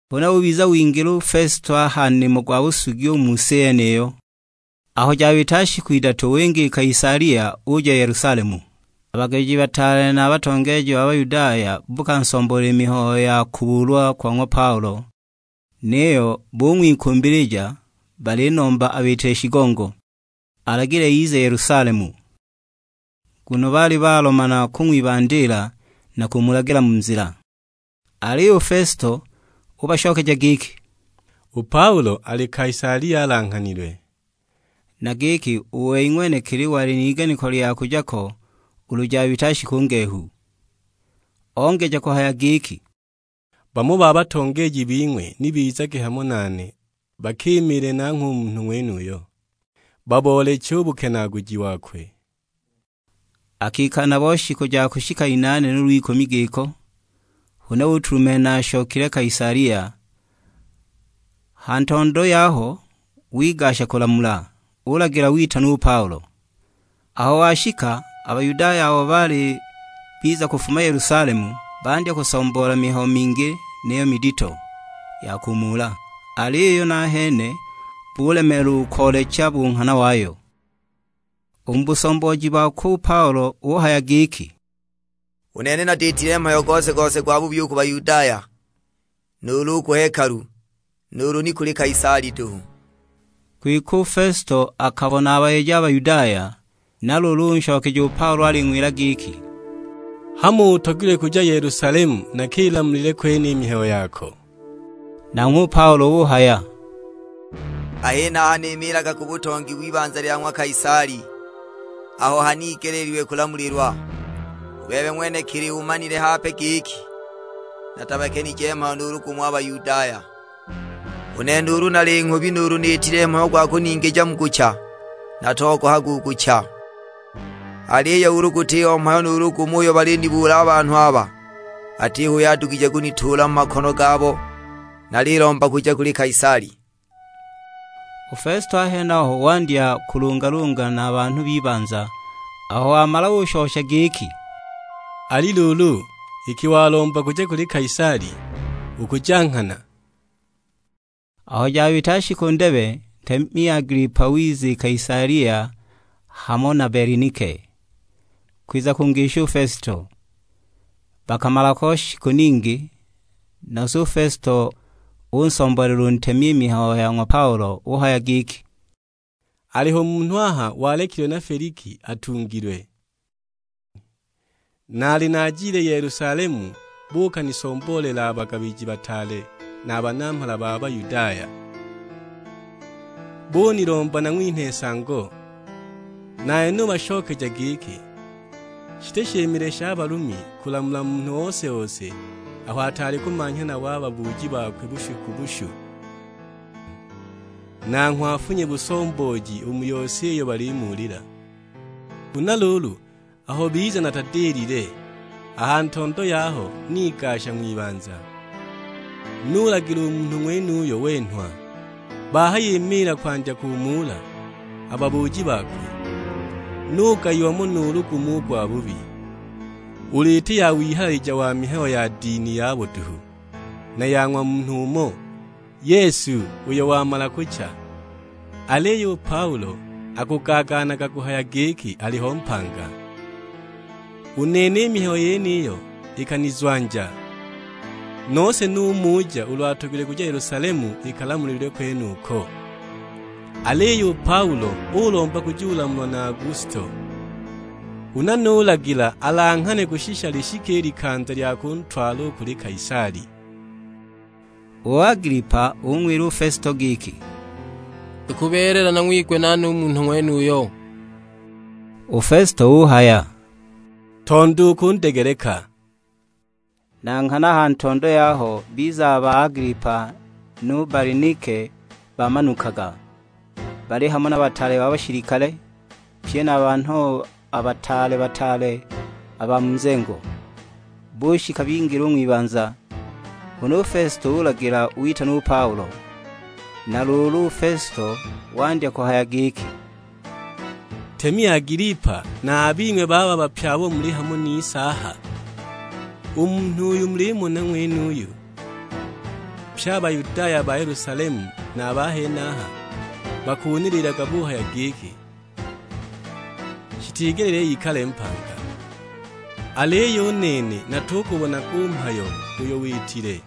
Huna ubiza wingila Fesito a ha nimo gwa busugi u mu si yeniyo; aho jabita shiku idatu winga i Kaisalia uja Yelusalemu. A bagabiji bataale na a batongeeji ba Bayudaya buukansomboolela i mihayo ya kubuulwa kwa ng'wa Paulo, niyo bung'wikumbilija balinomba abiitile shigongo; alagile ize Yelusalemu, nguno baali balomana kung'wibandiila na kumulagila mu nzila. Aliyo u Fesito ubashokeja giki, "U Paulo ali Kaisalia alanghanilwe;" na giki u wei ng'wenekili wali n'iganiko lya kuja ko ulu jabita shiku ngehu. Ongeja kuhaya giki, "Bamo ba batongeeji bing'we ni bizage hamo nane bakimiile nanghwe u munhu ng'wenuyo, babooleche u bukenaaguji bokwe". Akikala nabo shiku ja kushika inaane nuulu ikumi giko, huna utulumenha ashokile Kaisalia; ha ntondo yaho wigasha kulamula, ulagila witanwa u Paulo. Aho washika, a Bayudaya abo baali biza kufuma Yelusalemu, bandya kusomboola mihayo mingi niyo midito, ya kumuula; aliyo nahene bulemeelwa u koolecha u bunghana wayo. U mu busombooji bokwe u Paulo uhaya giki, "U nene natiitile mhayo gose-gose gwabubi u ku Bayudaya, nuulu u ku hekalu, nuulu ni kuli Kaisali duhu." Kwike u Fesito akabona abayeje a Bayudaya, na luulu unshokeja u Paulo aling'wila giki, "Hamo utogilwe kuja Yelusalemu nakilamulile kwene i mihayo yako?" Nanghwe u Paulo uhaya, "A henaha nimiilaga ku butongi w'ibanza lya ng'wa Kaisali, aho hanigeleelilwe kulamulilwa. U bebe ng'wenekili umanile hape giki natabakenije mhayo nuulu gumo a Bayudaya. U nene ulu nali nghubi nuulu niitile mhayo gwa kuningija mu kucha, natogohaga u kucha, aliyo ulu gutiho mhayo nuulu gumo uyo balinibuula a banhu aba, atiho uyo adugije kunituula mu makono gabo. Nalilomba kuja kuli Kaisali!" U Fesito a henaho wandya kulungalunga na a banhu b'ibanza; aho wamala ushosha giki, "Ali luulu, iki walomba kuja kuli Kaisali, ukuja nghana!" Aho jabita shiku ndebe, ntemi Agilipa wiza i Kaisalia hamo na Belinike, kwiza kungisha u Fesito. Bakamala ho shiku ningi, nose u Fesito unsomboolela u ntemi i mihayo ya ng'wa Paulo; uhaya giki, "Aliho munhu aha walekilwe na Feliki atungilwe. Naali naajile Yelusalemu buukanisomboolela a bagabiji bataale na a banamhala ba Bayudaya, bunilomba nang'winhe nsango. Nane nubashokeja giki, shiti shimile sha Balumi kulamula munhu ose-ose aho ataali kumanhya nabo a babuuji bakwe bushu ku bushu, nanghwe afunye busombooji u mu yose iyo balimuulila. Huna luulu aho biza natadilile; a ha ntondo yaho nigasha ng'wibanza, nulagila u munhu ng'wenuyo wenhwa. Bahayimiila kwandya kumuula a babuuji bakwe, nugayiwa mo nuulu gumo u gwabubi; ulu iti ya wihalalija wa mihayo ya dini yabo duhu, na ya ng'wa munhu umo, Yesu, uyo wamala kucha; aliyo u Paulo akugaagaanaga kuhaya giki aliho mpanga! U nene i mihayo yeniyo ikanizwanja, nose numuja ulu atogilwe kuja Yelusalemu ikalamulilwe kwenuko. Aliyo u Paulo ulomba kujulamulwa na Augusto, huna nulagila alanghanwe kushisha lishike i likanza lya kuntwala u kuli Kaisali." U Agilipa ung'wila u Fesito giki, "Ikubeelela nang'wigwe nane u munhu ng'wenuyo." U Fesito uhaya, "Ntondo ukundegeleka." Na nghana aha ntondo yaho biza a ba Agilipa nu Balinike baamanukaga, baali hamo na bataale ba bashilikale, pye na a banhu a bataale-bataale a ba mu nzengo. Bushika bingila u ng'wibanza, huna u Fesito ulagila witanwa u Paulo. Na luulu u Fesito wandya kuhaya giki, "Ntemi Agilipa na a bing'we bababa pye abo muli hamo nise aha, u munhu uyo mulimona ng'wenuyu, pye a Bayudaya ba Yelusalemu na a ba henaha bakunililiilaga buhaya giki, shitigelile ikale mpanga. Aliyo u nene natugubonaga u mhayo uyo witile,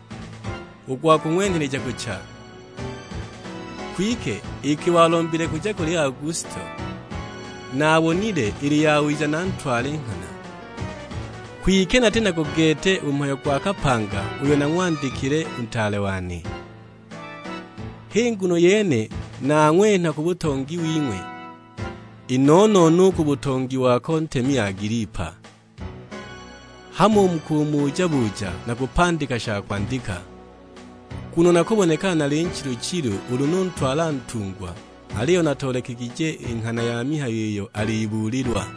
u gwa kung'wenheleja kucha; kwike iki walombile kuja kuli Augusto, naabonile ili yawiza nantwale nghana. Kwike nati nago gete u mhayo gwa kapanga uyo nalang'wandikile u ntaale wane; h'i nguno yene nang'wenha ku butongi wing'we. I no-no-no u ku butongi wako ntemi Agilipa. Hamo u mu kumuja-buja nakupandika sha kwandika. Nguno nakubonekana nali nchilu-chilu ulu nutwala ntungwa aliyo natoolekegije i nghana ya mihayo iyo alibuulilwa."